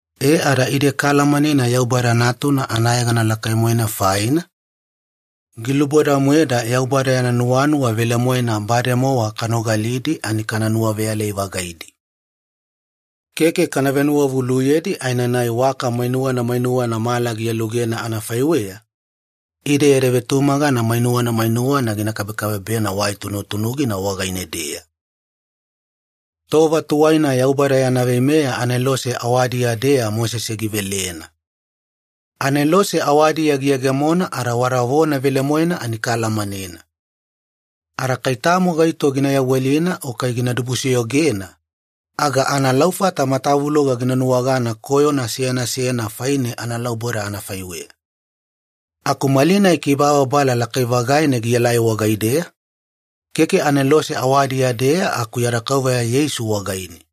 E ada ide kaalamanena Yaubada Natuna anayegana lakai-moena faina, giluboda-moeda Yaubada yana nuwanuwa velemoena bademowa kanogalidi ani kana nuwaveyalai-vagaidi. Keke kana venuwavuluyedi aenanai waka mainuwana mainuwana mala gialugena anafaiweya, ide yada vetumagana mainuwana mainuwana gina kabekabebena wai tunutunugina wagaine-deya. Tova tuwaina Yaubada yana veimeya anelose awadiya-deya Mosese givelena. Anelose awadiya giyegemona ada wada vona velemoena ani kaalamanena. Ada kai tamo gaito gina yawelina o kai gina dibusoyogena, aga analaufata matavuloga gina nuwagana koyona seyana seyana faine analauboda anafaiweya. Aku malinai kibababala lakai-vagaina gielai wagaideya, keke anelose awadiya-deya aku yada Kauveya Yeisu wagaine.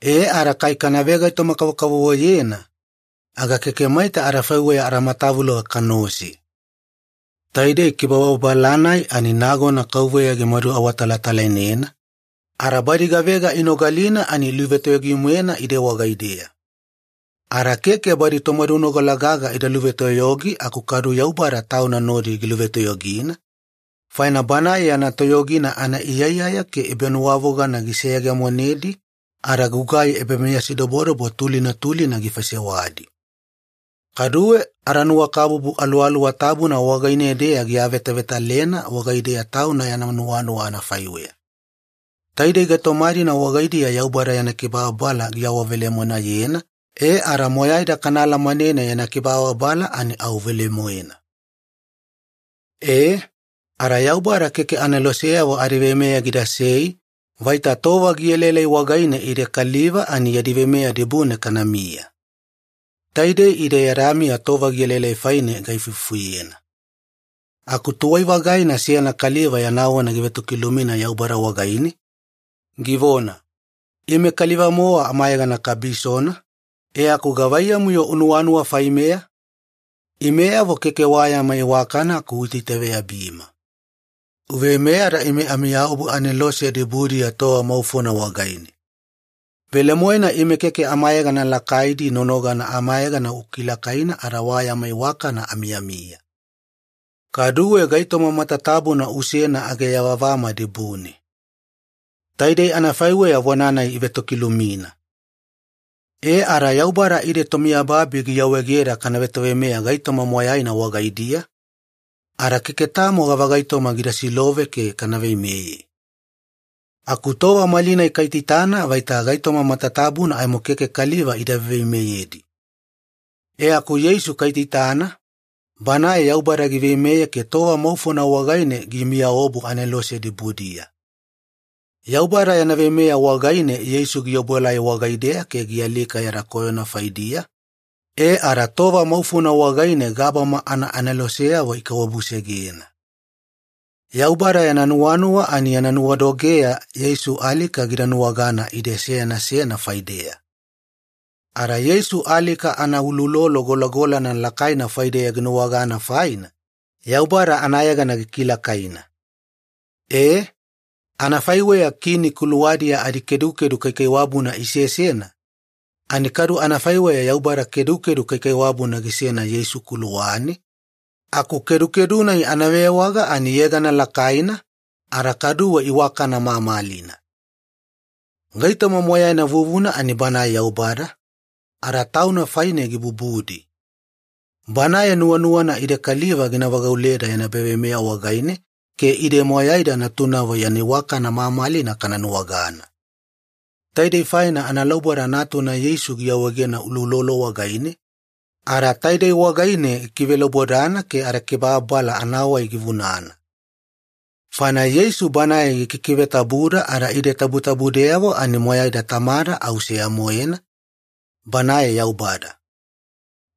E ada kai kana vegaitoma-kavokavovoyena, aga keke maita adafaiweya adamatavuloga kanaose. Taidei kibababala-nai ani nagona Kauveya gimadu awatalatalainena, ada badi gavega inogalina ani iluvetoyogi-moena ide wagaideya. Ada keke badi tomadunogala gaga ida luvetoyogi aku kadu Yaubada Tauna nodi giluvetoyogina, faina Banae yana toyogina anaiyaiyaya ke ebanuwavogana giseyegemonedi ada gugai ebameyasidobodobo tulina tulina gifaisewadi. Kaduwe adanuwakabubu Aluwaluwa Tabuna wagaine-deya giavetavetalena wagaideya Tauna yana nuwanuwa anafaiweya. Taidei gaitoma-dina wagaidiya Yaubada yana kibababala giawavelemoenayena, e ada moyaida kana alamanena yana kibababala ani au velemoena. E, ada Yaubada keke aneloseyavo adiveimeya gidasei vaita tova gielaelai wagaine ide kaliva ani yadi veimeya dibune kanamiya. Taidei ide yada miya tova gielaelai faine gaifufuyena. Aku tuwai-vagaina seyana kaliva yana vona givetokilumina Yaubada wagaine, givona, “Ime kaliva-mowa amayegana kabisona, e aku gavaiyamu-yo unuwanuwa faimeya? Imeyavo keke wa yama iwakana aku uitaitaveyabima. Uveimeya ada ime amiyaobu anelose dibudiya tova maufona wagaine. Velemoena ime keke amayegana lakaidi nonogana amayegana ukilakaina ada wa yama iwakana amiyamiya. Kaduwe gaitoma matatabuna usena age ayavavama dibune.” Taidei anafaiweya vona-nai ivetokilumina. E ada Yaubada ide tomiyababi giawaegeda kana vetoveimeya gaitoma moyaina wagaidiya, ada keke tamo gavagaitoma gida silove ke kana veimeye. Aku tova malinai kaitaitana vaita gaitoma matatabuna aimo keke kaliva ida veiveimeyedi. E aku Yeisu kaitaitana, Banae Yaubada giveimeye ke tova maufona wagaine gimiyaobu anelose dibudiya. Yaubada yana veimeya wagaine Yeisu giobuelai wagaideya ke gialika yada koyona faidiya, e ada tova maufona wagaine gabama anaaneloseyavo ikaiwabusegena. Yaubada yana nuwanuwa ani yana nuwadogeya Yeisu alika gida nuwagana ide seyana seyana faideya. Ada Yeisu alika anauloulolo golagolana lakaina faideya ginuwagana faina, Yaubada anayegana gikilakaina. E, anafaiweya kini kuluwadiya adikedukedu kaikaiwabuna isesena, ani kadu anafaiweya Yaubada kedukedu kaikaiwabuna gisena Yeisu kuluwane, aku kedukedu-nai anavewaga ani ‘yegana lakaina’ ada kaduwe ‘iwakana mamalina’. Gaitoma moyaina vuvuna ani Banae Yaubada, ada Tauna faine gibubudi. Banae nuwanuwana ide kaliva gina vagauleda yana ebaveimeya wagaine, ke ide moyaida natunavo yana iwakana mamalina kana nuwagana. Taidei faina analauboda Natuna Yeisu giawaegena uloulolo wagaine, ada taide wagaine gikivelaubodana ke adakibababala anawai givunana. Faina Yeisu Banae gikikivetabuda ada ide tabutabudeyavo ani moyaida Tamada au seya-moena, Banae Yaubada.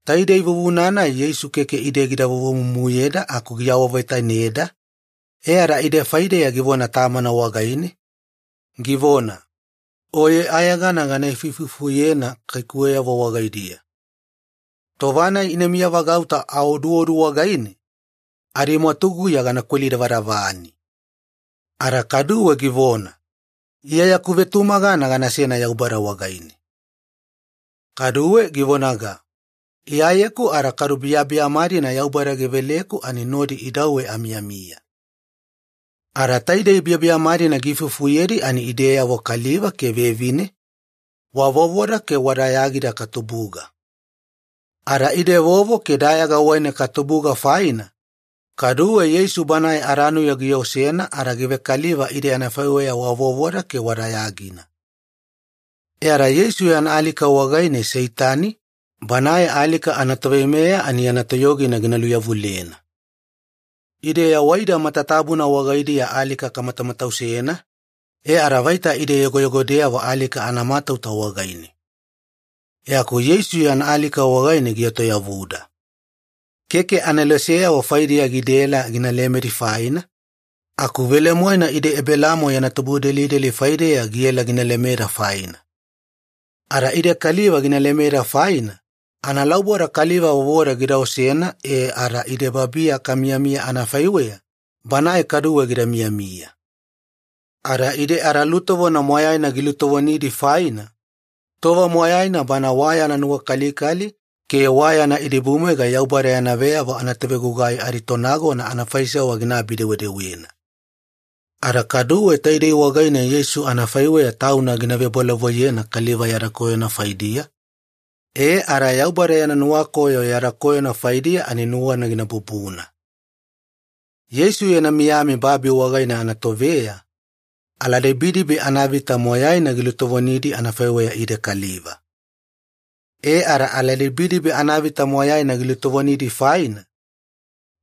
Taidei vuvuna-nai Yeisu keke ide gida vovomumuyeda aku giawavetaineda, e ada ide faideya givona Tamana wagaine, givona, “Oye ayegana gana ifuifufuyena kaikuweyavo wagaidiya. Tova-nai ina miyavagauta aoduodu wagaine, adimwatuguya gana kwelidavadavani.” Ada kaduwe givona, “Iya yaku vetumagana ganasena Yaubada wagaine.” Kaduwe givonaga, “Iyayeku ada kadu biyabiyama-dina Yaubada giveleku ani nodi idauwe amiyamiya.” Ada taidei biyabiyama-dina giifufuyedi ani ideyavo kaliva ke vevine, wa vovoda ke wa dayagida katubuga. Ada ide vovo ke dayaga wagaine katubuga faina, kaduwe Yeisu Banae adanuya giosena ada givekaliva ide anafaiweya wa vovona ke wa dayagina. E ada Yeisu yana alika wagaine Seitani, banae alika anatoveimeya ani yana toyogina gina luyavulena. Ide yawaida matatabuna wagaidiya alika kamatamatausena, e ada vaita ide yogoyogodeyavo alika anamatauta wagaine. E aku Yeisu yana alika wagaine gietoyavuda. Keke aneloseyavo faidiya gidaela gina lemedi faina, aku velemoena ide Ebelaamo yana tubudelideli faideya giela gina lemeda faina. Ada ide kaliva gina lemeda faina, analauboda kaliva vovoda gida osena e ada ide babiya kamiyamiya anafaiweya, Banae kaduwe gida miyamiya. Ada ide adalutovona moyaina gilutovonidi faina, tova moyaina Bana wa yana nuwakalikali ke wa yana idibumwaiga Yaubada yana veyavo anatovegugai aditonagona anafaisewa ginaabi-dewedewena. Ada kaduwe taidei wagaine Yeisu anafaiweya Tauna gina vebolavoiyena kaliva yada koyona faidiya, e ada Yaubada yana nuwakoyo yada koyona faidiya ani nuwana gina bubuna. Yeisu yana miyami babi wagaine anatoveya, aladibidibi anavita moyaina gilutovonidi anafaiweya ide kaliva. E ada aladibidibi anavita moyaina gilutovonidi faina,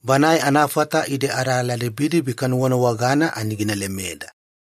Banae anafata ide aladibidibi kanuwanuwagana ani gina lemeda.